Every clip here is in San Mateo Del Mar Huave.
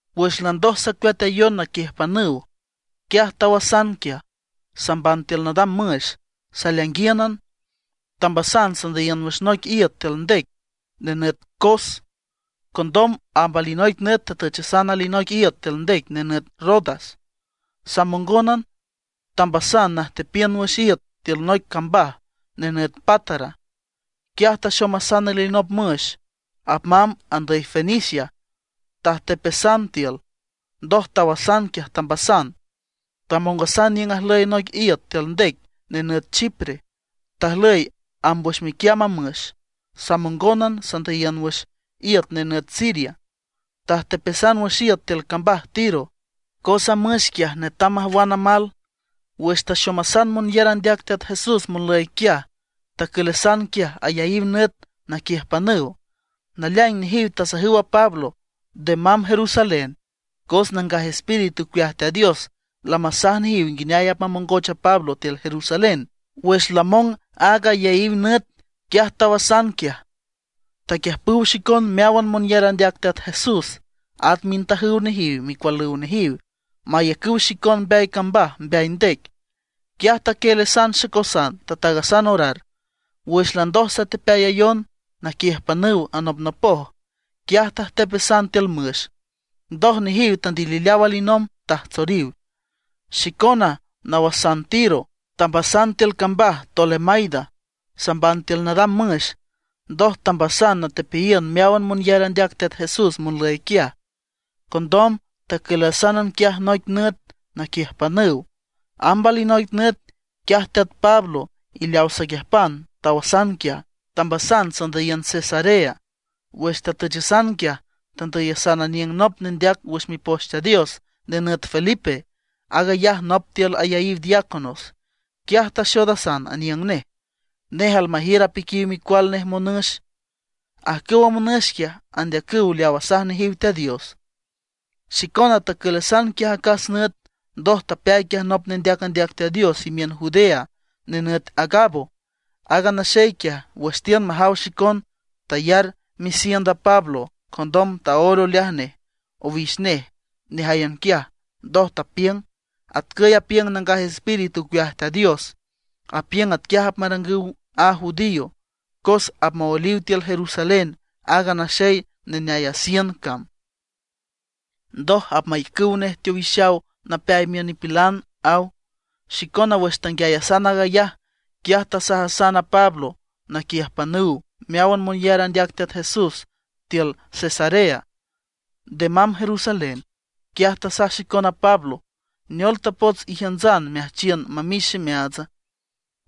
Wüx landoj sacueatayon naquiüjpanüw, quiaj tawasan quiaj, samban tiül nadam müx, saleainguíünan tambasan sandüyiün wüx noic iüt tiül ndec nenüt Cos. Condom amb alinoic nüt tatüchasan alinoic iüt tiül ndec nenüt Rodas, samongónan tambasan najtepiün wüx iüt tiül noic cambaj nenüt Pátara. Quiaj taxomasan alinop müx apmamb andüy Fenicia; tajtepasan tiül. Ndoj tawasan quiaj tambasan. Tamongasan niüng ajlüy noic iüt tiül ndec nenüt Chipre, tajlüy amb wüx miquiamb a müx, samongónan sandüyiün wüx iüt nenüt Siria. Tajtepasan wüx iüt tiül cambaj Tiro, cos a müx quiaj netam majwan amal. Wüx taxomasan monyar andeac Teat Jesús monlüy quiaj, tacülasan quiaj ayaíw nüt naquiüjpanüw. Naleaing nejiw tasajüw a Pablo nde mamb Jerusalén, cos Nangaj Espíritu ocueaj Teat Dios lamasaj nejiw nguineay apmamongoch a Pablo tiül Jerusalén. Wüx lamong aag ayaíw nüt, quiaj tawasan quiaj. Taquiüjpüw xicon meáwan monyar andeac Teat Jesús at mintajüw nejiw y micualüw nejiw, mayacüw xicon mbeay cambaj mbeay ndec. Quiaj taquieelasan xacosan, tataagasan orar. Wüx landoj satepeayayon naquiüjpanüw anopnopoj, quiaj tajtepasan tiül müx. Ndoj nejiw tandilileaw alinomb, tajtsoriw. Xicona nawasan Tiro, tambasan tiül cambaj Tolemaida, samban tiül nadam müx. Ndoj tambasan natepeayiün meáwan monyar andeac Teat Jesús monlüy quiaj. Condom tacülasan quiaj noic nüt naquiüjpanüw. Amb alinoic nüt, quiaj teat Pablo y leaw saquiüjpan tawasan quiaj, tambasan sandüyiün Cesarea. Wüx tatüchasan quiaj, tandüyasan aniüng nop nendeac wüx Mipoch Teat Dios, nenüt Felipe, aag ayaj nop tiül ayaíw diáconos. Quiaj taxoodasan aniüng nej. Nej almajiür apiquiw micual nej monüx. Ajcüwa monüx quiaj, andeacüw leaw asaj nejiw Teat Dios. Xicona tacülasan quiaj acas nüt. Ndoj tapeay quiaj nop nendeac andeac Teat Dios imiün Judea nenüt Agabo. Aaga naxey quiaj, wüx tiün majaw xicon, tayar misiend a Pablo. Condom taóel oleaj nej owix nej nejáyan quiaj. Ndoj tapiüng: ―Atcüy apiüng Nangaj Espíritu ocueaj Teat Dios, apiüng atquiaj apmarangüw a judíos, cos apmaoeliw tiül Jerusalén aaga naxey neneay a siend cam, ndoj apmayacüw nej teowixaw napeay miün nipilan ―aw. Xicona wüx tanguiayasan aag ayaj, quiaj tasajasan a Pablo naquiüjpanüw meáwan monyar andeac Teat Jesús tiül Cesarea, nde mamb Jerusalén. Quiaj tasaj xicon a Pablo: ―¿Neol tapots ijiüntsan meajchiün mamix ximeaatsa?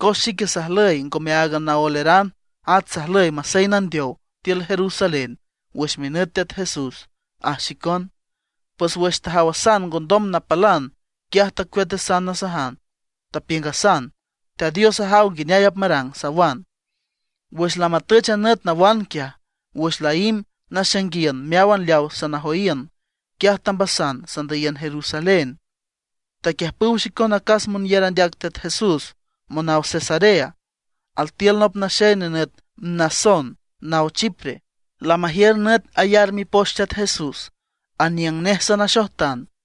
Cos xique sajlüy ngome áagan naoeleran, at sajlüy masey nandeow tiül Jerusalén wüx minüt Teat Jesús ―aj xicon. Pues wüx tajawasan ngondom napalan, quiaj tacueatasan nasajan, tapiüngasan: ―Teat Dios ajaw nguineay apmarang ―sawan. Wüx lamatüch a nüt nawan quiaj, wüx laímb naxainguiün meáwan leaw sanajoyiün, quiaj tambasan sandüyiün Jerusalén. Taquiüjpüw xicon acas monyar andeac Teat Jesús monaw Cesarea. Altiül nop naxey nenüt Mnasón naw Chipre, lamajiür nüt ayar mipoch Teat Jesús; aniüng nej sanaxojtan.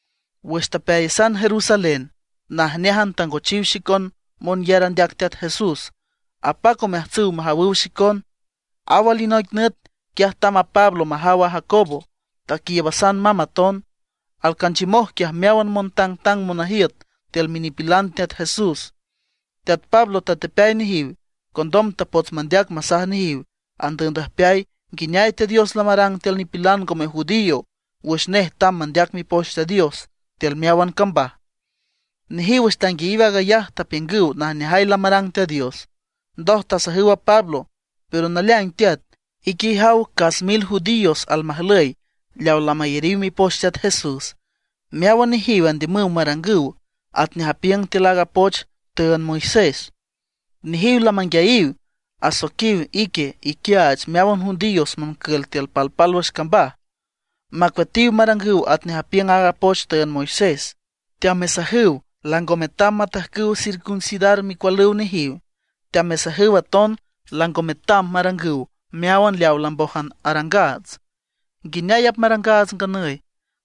Wüx tapeayasan Jerusalén, najneájan tangochiw xicon monyar andeac Teat Jesús, apac omeajtsüw majawüw xicon. Aw alinoic nüt, quiaj tamb a Pablo majaw a Jacobo, taquiiübasan mamb aton. Alcanchiümoj quiaj meáwan montangtang monajiüt tiül minipilan Teat Jesús. Teat Pablo tatepeay nejiw. Condom tapots mandeac masaj nejiw andüübndüjpeay nguineay Teat Dios lamarang tiül nipilan ngome judío wüx nej tamb mandeac Mipoch Teat Dios tiül meáwan cambaj. Nejiw wüx tanguiayiw aag ayaj, tapiüngüw najneajay lamarang Teat Dios. Ndoj tasajüw a Pablo: ―Pero naleaing teat, ique ijaw cas mil judíos almajlüy leaw lamayariw mipoch Teat Jesús. Meáwan nejiw andiümüw marangüw atnej apiüng tiül aaga poch tüünd Moisés. Nejiw lamanguiayiw, asoiquiw ique iquiaach meáwan judíos moncül tiül palpálwüx cambaj, macueatiw marangüw atnej apiüng aaga poch tüünd Moisés. Teamesajüw lango metam matajcüw circuncidar micualüw nejiw. Teamesajüw aton lango metam marangüw meáwan leawa lambójan arangaats. ¿Nguineay apmarangaats a nganüy?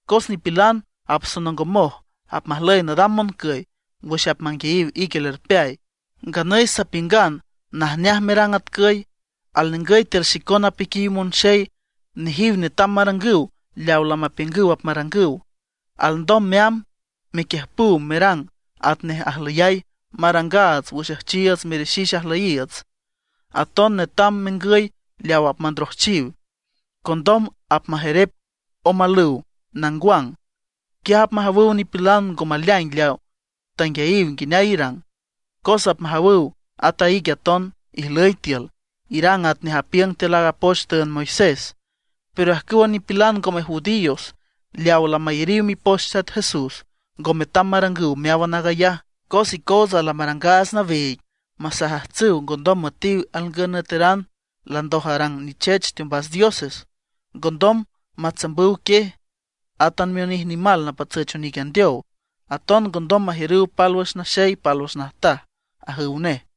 Cos nipilan apsonongomoj, apmajlüy nadam moncüy wüx apmanguiayiw ique lerpeay. Nganüy sapiüngan najneaj merang atcüy: Alningüy tiül xicona apiquiw monxey, nejiw netam marangüw leaw lamapiüngüw apmarangüw. Alndom meamb mequiüjpüw merangan atnej ajlüyay marangaats wüx üjchiiüts merixix ajlüyiiüts. Aton netam mengüy leaw apmandrojchiw. Condom apmajerep omalüw nangwang, quiaj apmajawüw nipilan ngo maleaing leaw tanguiayiw nguineay irang. Cos apmajawüw at a ique aton ijlüy tiül, irang atnej apiüng tiül aaga poch tüünd Moisés. Pero ajcüwa nipilan ngome judíos leaw lamayariw mipoch Teat Jesús, ngo metam marangüw meáwan aag ayaj. Cos icootsa lamarangaats nawiig masajajtsüw ngondom müetiw alngün nüeteran landoj arang nichech teombas dioses; ngondom matsambüw quiej, átan mionij nimal napatsüch onic andeow. Aton ngondom majiürüw pálwüx naxey pálwüx najtaj ―ajüw nej.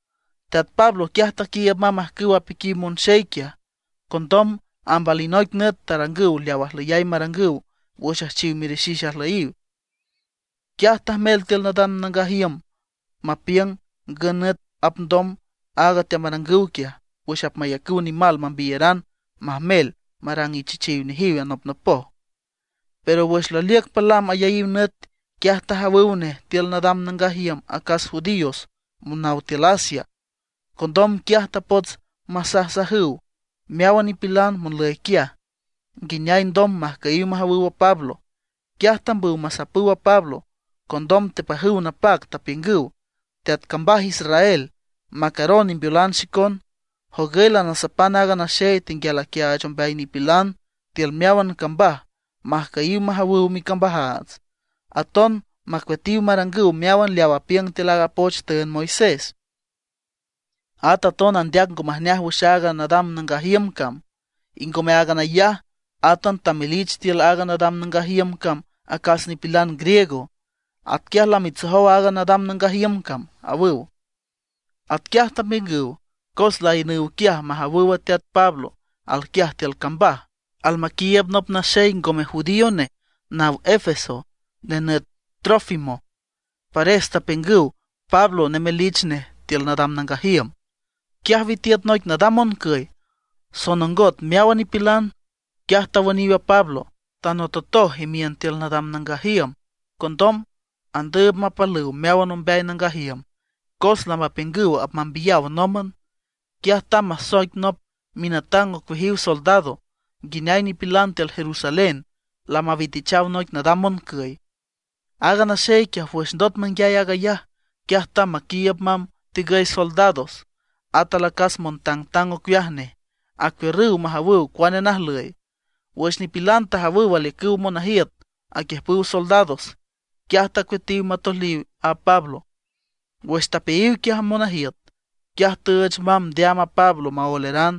Teat Pablo quiaj taquiiüb mamb ajcüwa piquiw monxey quiaj. Condom amb alinoic nüt tarangüw leaw ajlüyay marangüw wüx üjchiw merixix ajlüyiw. Quiaj tajmel tiül nadam nangaj iüm mapiüng ngün nüt apndom aaga teamarangüw quiaj wüx apmayacüw nimal mambiyaran majmel marang ichechiw nejiw anopnopoj. Pero wüx laliüc palam ayaíw nüt, quiaj tajawüw nej tiül nadam nangaj iüm acas judíos monaw tiül Asia. Condom quiaj tapots masajsajüw meáwan nipilan monlüy quiaj, nguineay ndom majcüyiw majawüw a Pablo. Quiaj tambüw masapüw a Pablo. Condom tepajüw napac, tapiüngüw: ―¡Teat cambaj Israel, macaron imbeolan xicon! Jogüy lanasapan aaga naxey tenguial aquiaach ombeay nipilan tiül meáwan cambaj majcüyiw majawüw micambajaats, aton macueatiw marangüw meáwan leaw apiüng tiül aaga poch tüünd Moisés. At aton andeac ngo majneaj wüx aaga nadam nangaj iüm cam. Y ngome áagan ayaj, átan lamamelich tiül aaga nadam nangaj iüm cam acas nipilan griego; atquiay lamitsojow aaga nadam nangaj iüm cam ―awüw. Atquiaj tapiüngüw cos laiünüw quiaj majawüw a teat Pablo alquiaj tiül cambaj, almaquiiüb nop naxey ngome judío nej, naw Éfeso, nenüt Trófimo. Pares tapiüngüw Pablo nemelich nej tiül nadam nangaj iüm. Quiaj witiüt noic nadam moncüy, sonongot meáwan nipilan. Quiaj tawüniw a Pablo, tanototoj imiün tiül nadam nangaj iüm. Condom andüüb mapalüw meáwan ombeay nangaj iüm. Cos lamapiüngüw apmambiyaw nómban, quiaj tamb masoic nop minatang ocueajiw soldados, nguineay nipilan tiül Jerusalén lamawitichaw noic nadam moncüy. Aaga naxey quiaj wüx ndot manguiay aag ayaj, quiaj tamb maquiiüb mamb tigüy soldados, at alacas montangtang ocueaj nej, acuiürrüw majawüw cuane najlüy. Wüx nipilan tajawüw aliücüw monajiüt aquiüjpüw soldados, quiaj tacueatiw matoeliw a Pablo. Wüx tapeayiw quiaj a monajiüt, quiaj tüüch mamb ndeaam a Pablo maoeleran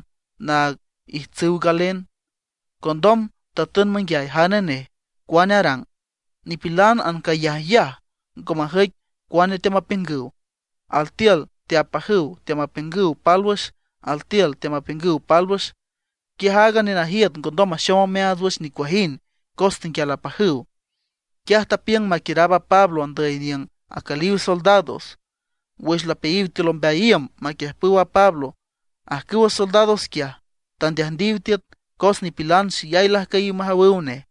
naag ijtsüw galen. Condom tatün manguiay jane nej, cuane arang. Nipilan ancayajyaj ngo majüic cuane teamapiüngüw. Altiül teapajüw teamapiüngüw pálwüx, altiül teamapiüngüw pálwüx. Quiaj aaga nenajiüt ngondom maxom omeaats wüx nicuajind cos tenguial apajüw. Quiaj tapiüng maquiüraab a Pablo andüy niüng acüliw soldados. Wüx lapeayiw tiül ombeay iüm maquiüjpüw a Pablo, ajcüwa soldados quiaj tandeajndiw tiüt, cos nipilan xeyay lajcüyiw majawüw nej.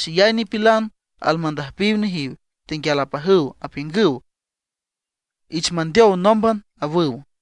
Xeyay nipilan almandüjpiw nejiw, tenguial apajüw, apiüngüw: ―¡Ich mandeow nómban! ―awüw.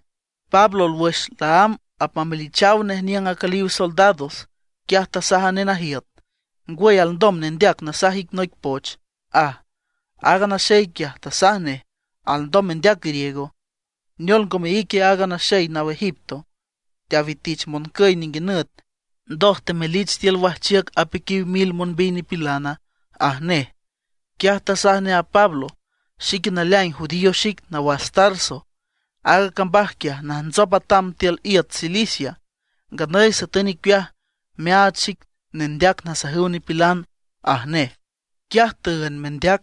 Pablo wüx laámb apmamelichaw nej niüng acüliw soldados, quiaj tasaj a nenajiüt: ―¿Ngwüy, alndom nendeac nasaj ic noic poch? ―aj. Aaga naxey quiaj tasaj nej: ―¿Alndom mendeac griego? ¿Neol, ngome ique aaga naxey naw Egipto, teawitich moncüy ninguinüt, ndoj temelich tiül wajchiüc apiquiw mil monbiy nipilana? ―aj nej. Quiaj tasaj nej a Pablo: ―Xique naleaing judío xic, nawas Tarso. Aaga cambaj quiaj najntsop atam tiül iüt Cilicia. Nganüy satün icueaj meaach xic nendeac nasajüw nipilan ―aj nej. Quiaj tüünd mendeac,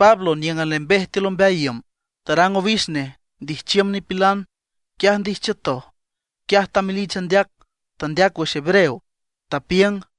Pablo níüngan lembej tiül ombeay iüm, tarang owix nej ndijchiüm nipilan. Wüx ndijchiütoj, quiaj tamelich andeac, tandeac wüx hebreo, tapiüng: